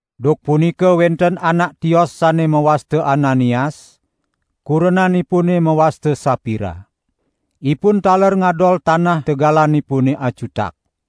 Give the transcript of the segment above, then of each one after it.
Duk punika wenten anak tios sane mawasta Ananias, kurenanipune mawasta Sapira. Ipun taler ngadol tanah tegalanipune acutak.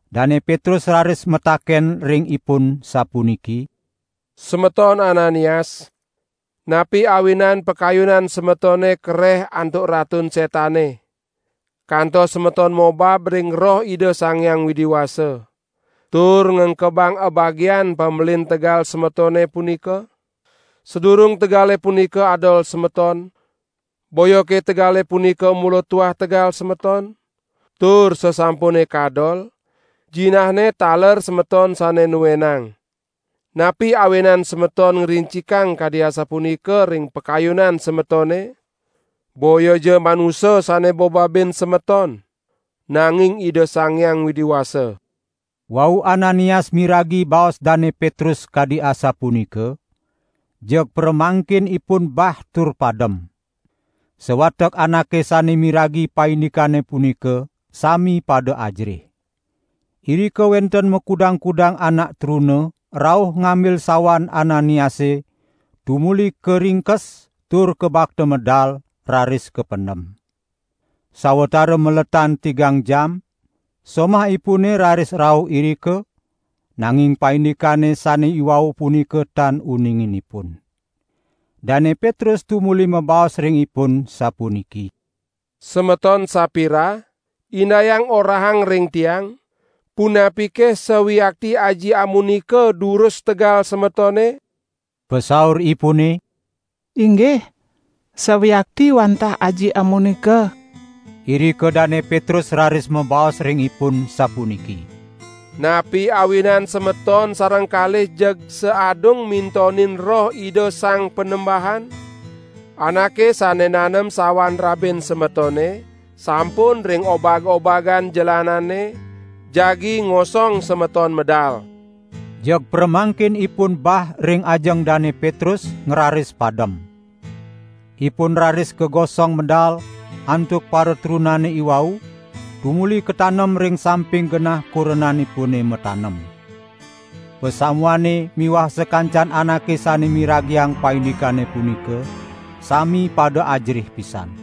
Dane Petrus raris mataken ring ipun sapuniki: "Semeton Ananias, napi awinan pakayunan semetone kareh antuk Ratun Setane, kantos semeton mobab ring Roh Ida Sang Hyang Widi Wasa, tur ngengkebang abagian pamelin tegal semetone punika? Sadurung tegale punika adol semeton, boyake tegale punika mula tuah tegal semeton? Tur sasampune kadol, jinahne taler semeton sane nuenang. Napi awinan semeton ngrincikang kadi asapunika ring pakayunan semetone? Boyaja manusa sane bobabin semeton, nanging Ida Sang Hyang Widi Wasa!" Wau Ananias miragi baos Dane Petrus kadi asapunika, jeg pramangkin ipun bah tur padem. Sawatek anake sane miragi paindikane punika sami pada ajerih. Irika wenten makudang-kudang anak truna rauh ngambil sawan Ananiase tumuli karingkes tur kabakta medal, raris kapendem. Sawatara maletan tigang jam, somahipune raris rauh irika, nanging paindikane sane iwau punika tan uningin ipun. Dane Petrus tumuli mabaos ring ipun, sapuniki: "Semeton Sapira, indayang orahang ring tiang, punapike sawiakti aji amunika durus tegal semetone?" Pasauripune: "Inggih sawiakti wantah aji amunika!" Irika Dane Petrus raris mabaos ring ipun sapuniki: "Napi awinan semeton sareng kalih jeg saadung mintonin Roh Ida Sang Panembahan? Anake sane nanem sawan rabin semetone, sampun ring obag-obagan jelanane, jagi ngosong semeton medal." Jeg pramangkin ipun bah ring ajeng Dane Petrus, ngraris padem. Ipun raris kagosong medal, antuk paratrunane iwau, tumuli katanem ring samping genah kurenanipune matanem. Pasamuane miwah sakancan anake sane miragiang paindikane punika, sami pada ajerih pisan.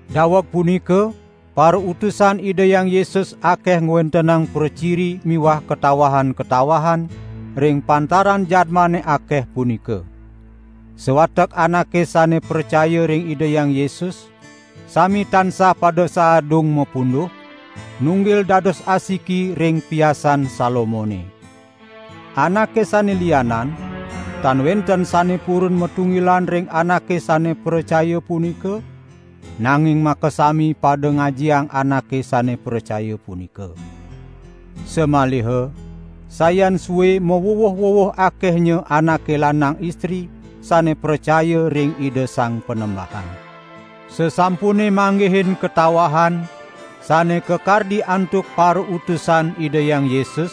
Daweg punika parautusan Ida Hyang Yesus akeh ngwentenang praciri miwah katawahan-katawahan ring pantaran jadmane akeh punika. Sawatek anake sane pracaya ring Ida Hyang Yesus sami tansah pada saadung mapunduh, nunggil dados asiki ring Piasan Salomone. Anake sane lianan, tan wenten sane purun matunggilan ring anake sane pracaya punika, nanging makasami pada ngajiang anake sane pracaya punika. Samaliha sayan sue mawuwuh-wuwuh akehnya anake lanang istri sane pracaya ring Ida Sang Panembahan. Sasampune manggihin katawahan sane kakardi antuk parautusan Ida Hyang Yesus,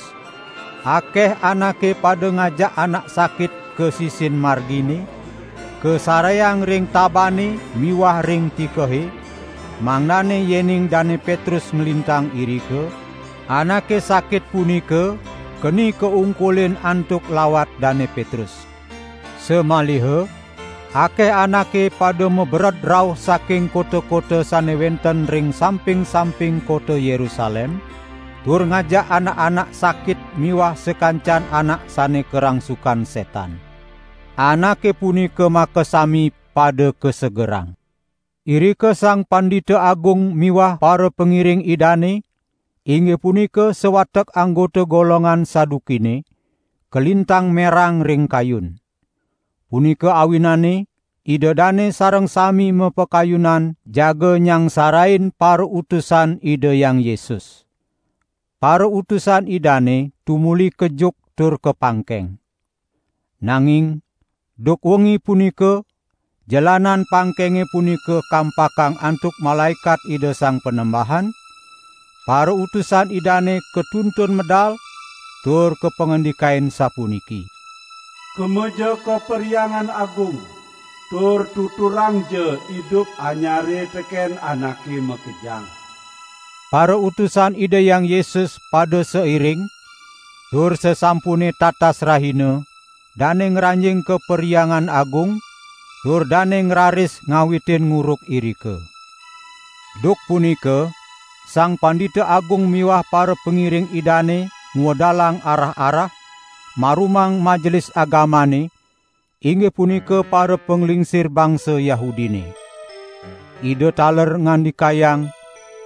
akeh anake pada ngajak anak sakit ka sisin margine, kasareang ring tabane miwah ring tikehe, mangdane yening Dane Petrus nglintang irika, anake sakit punika keni kaungkulin antuk lawat Dane Petrus. Samaliha akeh anake pada mabered rauh saking kota-kota sane wenten ring samping-samping kota Yerusalem, tur ngajak anak-anak sakit miwah sakancan anak sane karangsukan setan. Anake punika makasami pada kasegerang. Irika Sang Pandita Agung miwah parapangiring idane, inggih punika sawatek anggota golongan Sadukine, kalintang merang ring kayun. Punika awinane ida dane sareng sami mapakayunan jaga nyangsarain parautusan Ida Hyang Yesus. Parautusan Idane tumuli kejuk tur kapangkeng. Nanging duk wengi punika jelanan pangkenge punika kampakang antuk malaekat Ida Sang Panembahan, parautusan Idane katuntun medal, tur kapangandikain sapuniki: "Kemaja ka Perhyangan Agung, tur tuturangja idup anyare teken anake makejang." Parautusan Ida Hyang Yesus pada sairing, tur sasampune tatas rahina dane ngranjing ka Perhyangan Agung tur dane ngraris ngawitin nguruk irika. Duk punika Sang Pandita Agung miwah parapangiring idane ngwedalang arah-arah, marumang Majelis Agamane, inggih punika parapanglingsir bangsa Yahudine. Ida taler ngandikayang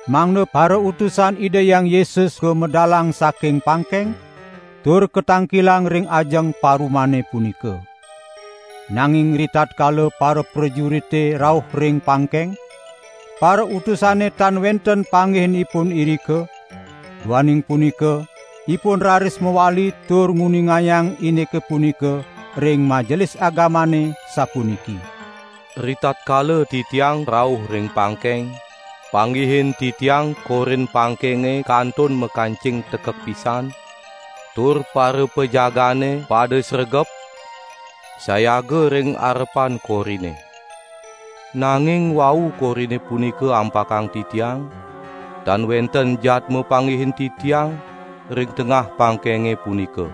mangda parautusan Ida Hyang Yesus kamedalang saking pangkeng, tur katangkilang ring ajeng parumane punika. Nanging ritatkala paraprajurite rauh ring pangkeng, parautusane tan wenten panggihin ipun irika, duaning punika ipun raris mawali tur nguningayang indike punika ring Majelis Agamane, sapuniki: "Ritatkala titiang rauh ring pangkeng, panggihin titiang korin pangkenge kantun makancing tekek pisan, tur parapajagaane pada sregep, sayaga ring arepan korine. Nanging wau korine punika ampakang titiang, tan wenten jadma panggihin titiang ring tengah pangkenge punika!"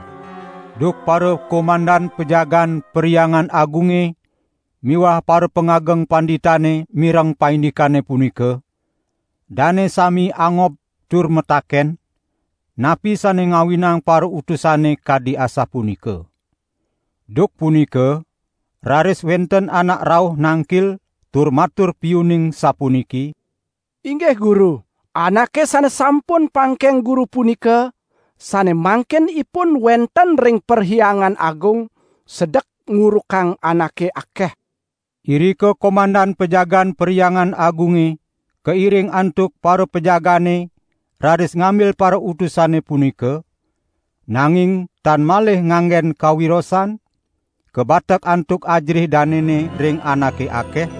Duk parakomandan pajagaan Perhyangan Agunge miwah parapangageng panditane mireng paindikane punika, dane sami angob tur mataken, napi sane ngawinang parautusane kadi asapunika. Duk punika raris wenten anak rauh nangkil tur matur piuning sapuniki: "Inggih guru, anake sane sampun pangkeng guru punika, sane mangkin ipun wenten ring Perhyangan Agung sedek ngurukang anake akeh!" Irika komandan pajagaan Perhyangan Agunge kairing antuk parapajagaane raris ngambil parautusane punika, nanging tan malih nganggen kawirosan, kabatek antuk ajerih danene ring anake akeh,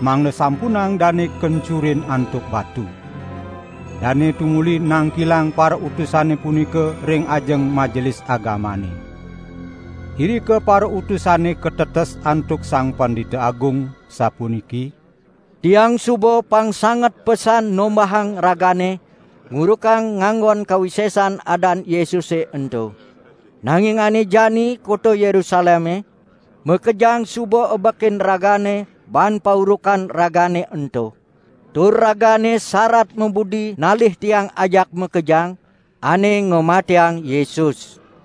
mangda sampunang dane kencurin antuk batu. Dane tumuli nangkilang parautusane punika ring ajeng Majelis Agamane. Irika parautusane katetes antuk Sang Pandita Agung, sapuniki: "Tiang suba pangsanget pesan nombahang ragane ngurukang nganggon kawisesan adan Yesuse ento. Nanging ane jani kota Yerusaleme makejang suba ebekin ragane baan paurukan ragane ento. Tur ragane sarat mabudi nalih tiang ajak makejang ane ngamatiang Yesus!"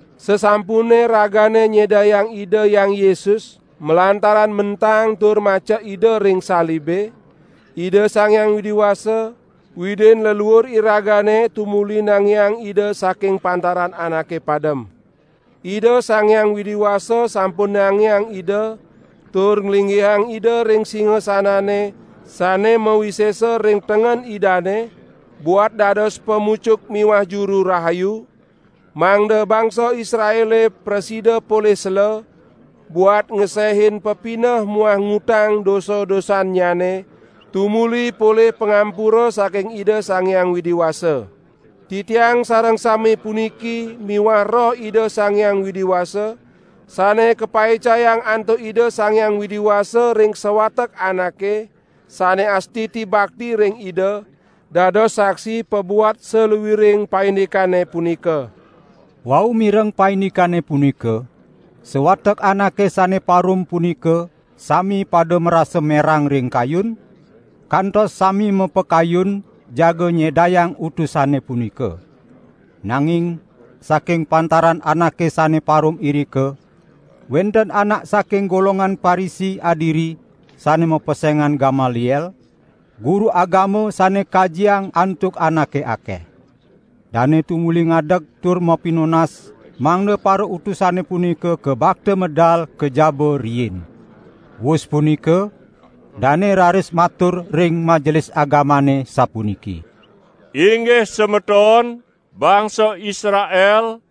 Sasampunne ragane nyedayang Ida Hyang Yesus malantaran mentang tur macek Ida ring salibe, Ida Sang Hyang Widi Wasa, Widin leluur iragane tumuli nangiang Ida saking pantaran anake padem. Ida Sang Hyang Widi Wasa sampun nangiang Ida tur nglinggihang Ida ring singasanane sane mawisesa ring tengen Idane buat dados Pamucuk miwah Juru Rahayu, mangda bangsa Israele prasida polih sela buat ngesehin pepineh muah ngutang dosa-dosannyane tumuli polih pangampura saking Ida Sang Hyang Widi Wasa. Titiang sareng sami puniki miwah Roh Ida Sang Hyang Widi Wasa, sane kapaicayang antuk Ida Sang Hyang Widi Wasa ring sawatek anake sane astiti bakti ring Ida, dados saksi pabuat saluiring paindikane punika." Wau mireng paindikane punika, sawatek anake sane parum punika sami pada marasa merang ring kayun, kantos sami mapakayun jaga nyedayang utusane punika. Nanging saking pantaran anake sane parum irika, wenten anak saking golongan Parisi adiri sane mapesengan Gamaliel, guru agama sane kajiang antuk anake akeh. Dane tumuli ngadeg tur mapinunas mangda parautusane punika kabakta medal ka jaba riin. Wus punika dane raris matur ring Majelis Agamane sapuniki: "Inggih semeton bangsa Israel,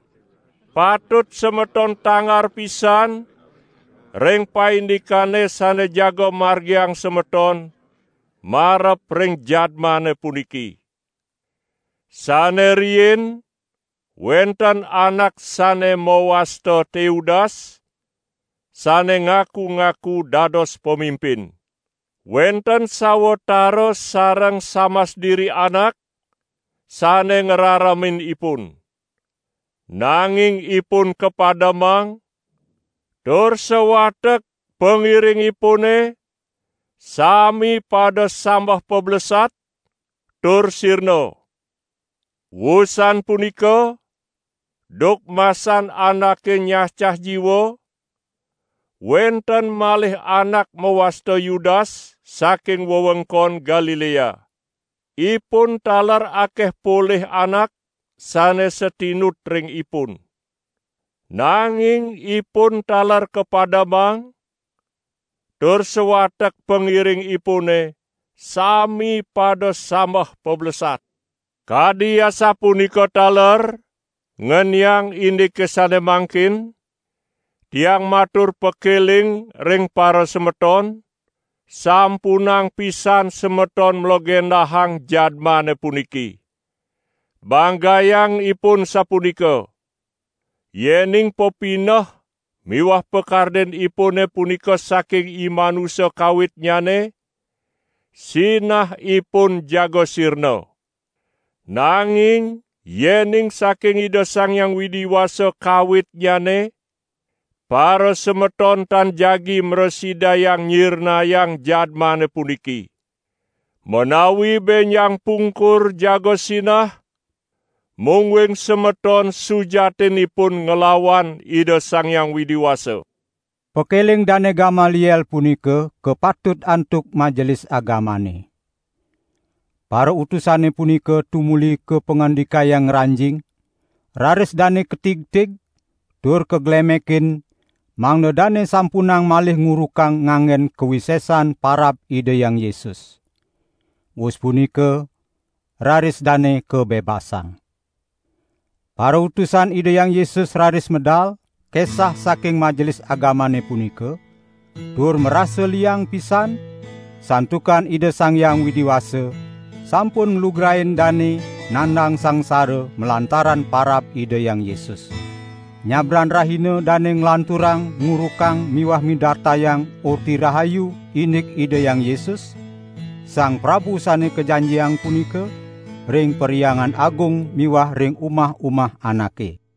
patut semeton tangar pisan ring paindikane sane jaga margiang semeton marep ring jadmane puniki. Sane riin wenten anak sane mawasta Teudas sane ngaku-ngaku dados pamimpin. Wenten sawatara sareng samas diri anak sane ngraremin ipun. Nanging ipun kapademang, tur sawatek pangiringipune sami pada sambeh pablesat, tur sirna. Wusan punika duk masan anake nyacah jiwa, wenten malih anak mawasta Yudas saking wewengkon Galilea. Ipun taler akeh polih anak sane satinut ring ipun. Nanging ipun taler kapademang tur sawatek pangiringipune sami pada sambeh pablesat. Kadi asapunika taler ngeniang indike sane mangkin, tiang matur pakeling ring parasemeton, sampunang pisan semeton mlegendahang jadmane puniki. Banggayang ipun sapunika. Yening pepineh miwah pakardinipune punika saking imanusa kawitnyane, sinah ipun jaga sirna. Nanging yening saking Ida Sang Hyang Widi Wasa kawitnyane, parasemeton tan jagi mrasidayang nyirnayang jadmane puniki. Menawi benjang pungkur jaga sinah, mungguing semeton sujatinipun nglawan Ida Sang Hyang Widi Wasa." Pakeling Dane Gamaliel punika kapatut antuk Majelis Agamane. Parautusane punika tumuli kapangandikayang ngranjing, raris dane katigtig tur kaglemekin mangda dane sampunang malih ngurukang nganggen kawisesan parab Ida Hyang Yesus. Wus punika raris dane kabebasang. Parautusan Ida Hyang Yesus raris medal, kesah saking Majelis Agamane punika, tur marasa liang pisan, santukan Ida Sang Hyang Widi Wasa sampun nglugrain dane nandang sangsara malantaran parab Ida Hyang Yesus. Nyabran rahina dane nglanturang ngurukang miwah midartayang Orti Rahayu indik Ida Hyang Yesus, Sang Prabu Sane Kajanjiang punika, ring Perhyangan Agung miwah ring umah-umah anake.